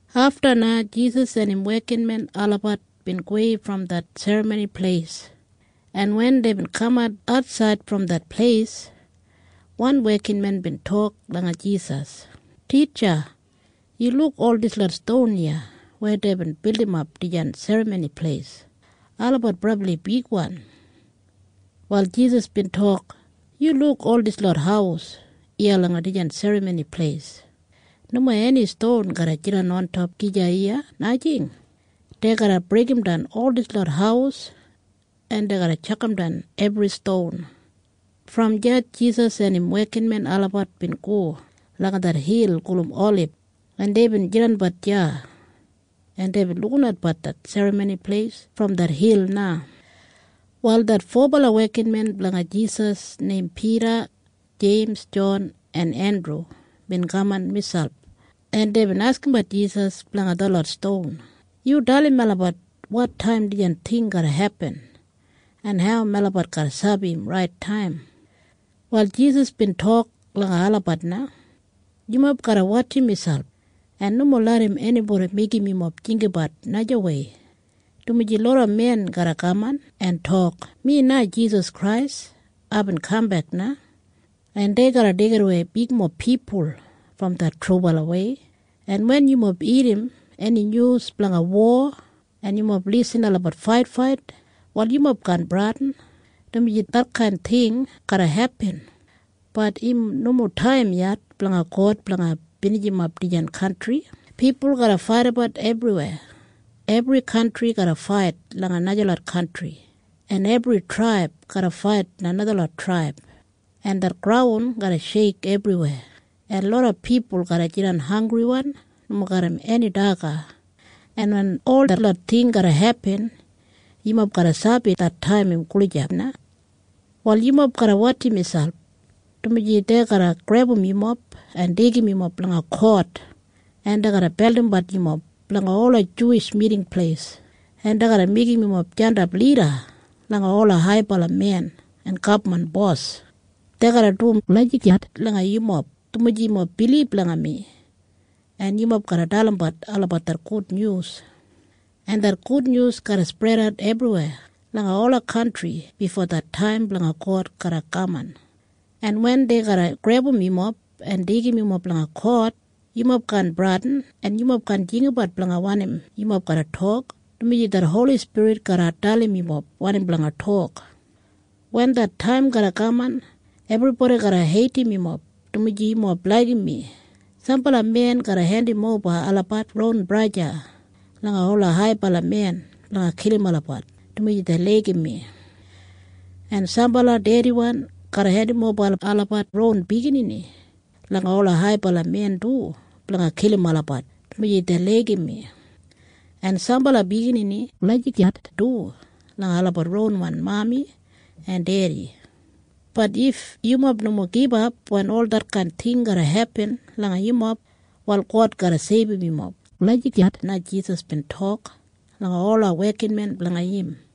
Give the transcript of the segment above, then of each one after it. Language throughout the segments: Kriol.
Afta na Jisas en im wekinmen olabat bin gowei brom det Serramoni Pleis, en wen deibin kamat atsaid brom det pleis, wan wekinmen bin tok langa Jisas, “Titja, yu luk ol dislot ston iya weya deibin bildimbat dijan Serramoni Pleis. Olabat brabli bigwan.” Wal Jisas bin tok, “Yu luk ol dislot haus iya langa dijan Serramoni Pleis? Nomo eni ston garra jidan ontop gija iya, najing. Dei garra breigimdan ol dislot haus en dei garra tjakamdan ebri ston.” Brom deya Jisas en im wekinmen olabat bin go langa det hil gulum Olib, en deibin jidanbat deya, en deibin lukinatbat det Serramoni Pleis brom det hil na. Wal det fobala wekinmen blanga Jisas neim Pida, Jeims, Jon en Endru bin kaman miselp, en deibin askimbat Jisas blanga detlot ston, “Yu dalim melabat wotaim dijan ting garra hepin en hau melabat garra sabi im rait taim.” Wal Jisas bin tok langa olabat na, “Yumob garra wotjim miselp en nomo larram enibodi meigim yumob jinggabat najawei, dumaji loda men garra kaman en tok, ‘Mi na Jisas Krais. Aibin kambek na.’ En dei garra deigidawei bigmob pipul brom det trubalawei. En wen yumob irrim eni nyus blanga wo, en yumob lisin olabat faitfait, wal yumob kaan bradin, dumaji detkain ting garra hepin. Bat im no mo det taim blanga God blanga binijimap dijan kantri. Pipul garra faidabat ebriweya. Ebri kantri garra fait langa najalot kantri, en ebri traib garra fait langa najalot traib, en det graun garra sheik ebriweya, en loda pipul garra jidan hanggriwan nomo garram eni daga. En wen ol detlot ting garra hepin, yumob garra sabi det taim im gulijap na. “Wal yumob garra wotjim miselp, dumaji dei garra grebum yumob en deigim yumob langa kot, en dei garra beldimbat yumob langa ola Juwish Miting Pleis, en dei garra meigim yumob jandap lida langa ola haibala men en gabman bos. Dei garra dum lagijat langa yumob, dumaji yumob bilib langa mi, en yumob garra dalimbat olabat det gudnyus, en det gudnyus garra spredat ebriweya langa ola kantri bifo det taim blanga God garra kaman. En wen dei garra grebum yumob en deigim yumob langa kot, yumob kaan bradin, en yumob kaan jinggabat blanga wanim yumob garra tok, dumaji det Holi Spirit garra dalim yumob wanim blanga tok. Wen det taim garra kaman, ebribodi garra heidim yumob, dumaji yumob laigim mi. Sambala men garra hendimoba olabat ronwan braja langa ola haibala men blanga kilim olabat dumaji dei laigim mi. En sambala dediwan garra hendimoba olabat ronwan biginini langa ola haibala men du blanga kilim olabat dumaji dei laigim mi. En sambala biginini garra lagijat du langa olabat ronwan mami en dedi. Bat if yumob nomo gibap wen ol detkain ting garra hepin langa yumob, wal God garra seibum yumob.” Lagijat na Jisas bin tok langa detlot wekinmen blanga im.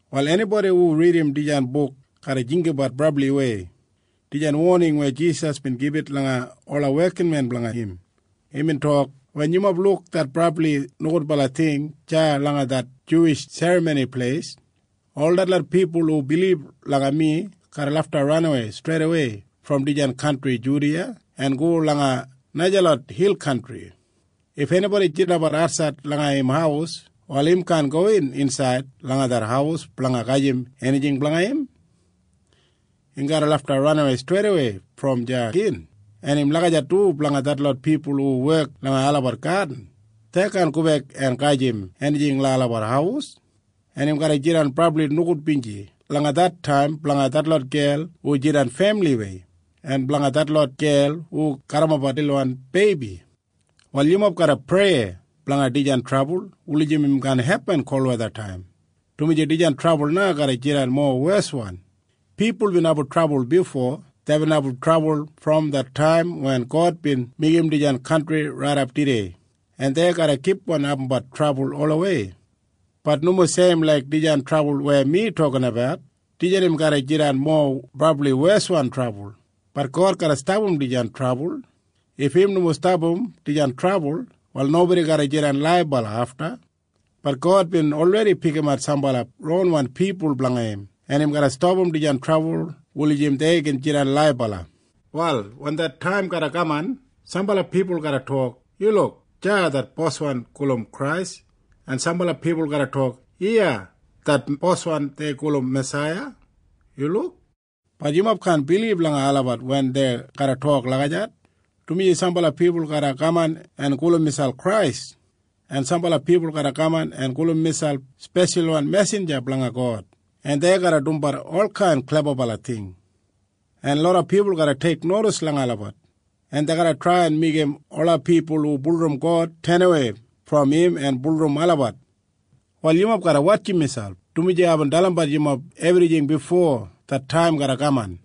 Wal enibodi hu ridim dijan buk garra jinggabat dijan woning brabliwei weya Jisas bin gibit langa ola wekinmen blanga im. Imbin tok, “Wen yumob luk det brabli nogudbala ting deya langa det Juwish Serramoni Pleis, wal ol detlot pipul hu bilib langa mi garra ranawei streidawei brom dijan kantri Judiya en go langa najalot hil kantri. If enibodi jidanbat atsaid langa im haus, wal im kaan gowin insaid langa det haus blanga gajim enijing blanga im. Im garra lafta ranawei streidawei brom deya gin. En im lagijat du blanga detlot pipul hu wek langa olabat gadin. Dei kaan gobek en gajim enijing langa olabat haus. En im garra jidan brabli nogudbinji langa det taim blanga detlot gel hu jidan femiliwei en blanga detlot gel hu garrimapbat lilwan beibi. “Wal yumob garra prei dijan trabul kaan hepin kolwethataim, dumaji dijan trabul na garra jidan mowa weswan. Pipul bin abum trabul bifo. Deibin abum trabul brom det taim wen God bin meigim dijan kantri raidap tudei. En dei garra kipgon abumbat trabul olawei. Bat im nomo seim laik dijan trabul weya mi tokabat. Dijan im garra jidan mowa brabli weswan trabul. Bat God garra stapam dijan trabul. If im nomo stapam dijan trabul, wal nobodi garra jidan laibala afta. Bat God bin olredi pikimat sambala ronwan pipul blanga im, en im garra stapam dijan trabul blanga album olabat jidan laibala. “Wal wen det taim garra kaman, sambala pipul garra tok, ‘Yu luk! Deya det boswan dei gulum Krais!’ En sambala pipul garra tok, ‘Iya det Boswan dei gulum Masaiya! Yu luk!’ Bat yumob kaan bilib langa olabat wen dei garra tok lagijat, dumaji sambala pipul garra kaman en gulum miselp Krais, en sambala pipul garra kaman en gulum miselp speshalwan mesinja blanga God. En dei garra dumbat olkain klebabala ting, en loda pipul garra teiknodis langa olabat, en dei garra trai en meigim ola pipul hu bulurrum God tenawei brom im en bulurrum olabat. Wal yumob garra wotjim miselp, dumaji aibin dalimbat yumob ebrijing bifo det taim garra kaman.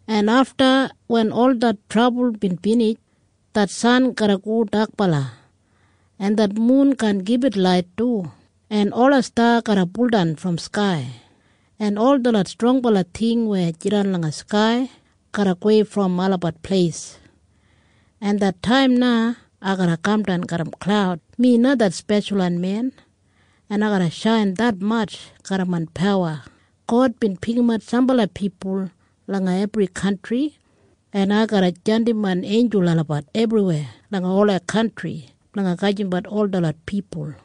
“En afta wen ol det trabul bin binij, det san garra go dakbala, en det mun kaan gibit lait du, en ola sta garra buldan brom skai, en ol detlot strongbala ting weya jidan langa skai garra gowei brom olabat pleis, en det taim na ai garra kamdan garram klaud. Mi na det Speshalwan Men, en ai garra shain detmatj garram main pawa. God bin pikimat sambala pipul langa ebri kantri, en ai garra jandim main einjul olabat ebriweya langa ola kantri blanga gajimbat ol detlot pipul.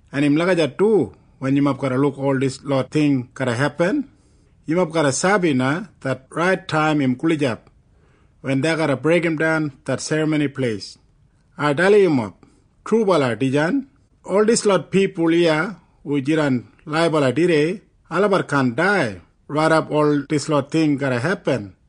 En im lagijat du wen yumob luk ol dislot ting garra hepin. Yumob garra sabi na det rait taim im gulijap wen dei garra breigimdan det Serramoni Pleis. Ai dalim yumob trubala dijan. Ol dislot pipul iya hu jidan laibala tudei, olabat kaan dai raidap ol dislot ting garra hepin.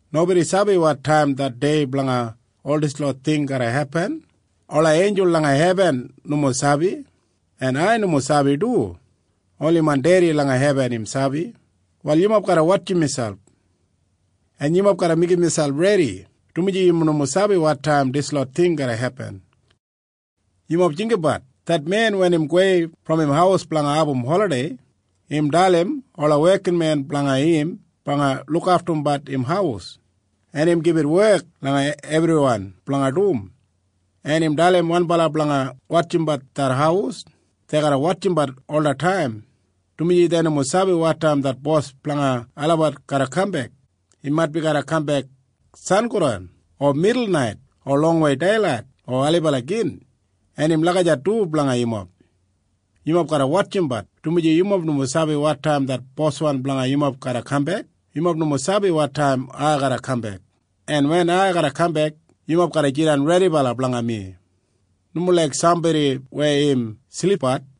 “Nobodi sabi wotaim det dei blanga ol dislot ting garra hepin. Ola einjul langa hebin nomo sabi, en ai nomo sabi du. Oni main Dedi langa hebin im sabi. Wal yumob garra wotjim miselp, en yumob garra meigim miselp redi, dumaji yumob nomo sabi wotaim dislot ting garra hepin. Yumob jinggabat det men wen im gowei longtaim brom im haus. Im dalim ola wekinmen blanga im blanga lukaftumbat im haus, en im gibit wek langa ebriwan blanga dum, en im dalim wanbala blanga wotjimbat det haus. Dei garra wotjimbat olataim, dumaji dei nomo sabi wotaim det bos blanga olabat garra kambek. Im maitbi garra kambek sangodan o midulnait o longwei deilait o ailibala gin. En im lagijat du blanga yumob. Yumob garra wotjimbat, dumaji yumob nomo sabi wotaim det boswan blanga yumob garra kambek. Yumob nomo sabi wotaim ai garra kambek. En wen ai kambek, yumob garra jidan redibala blanga mi, nomo laik sambodi weya im silipbat.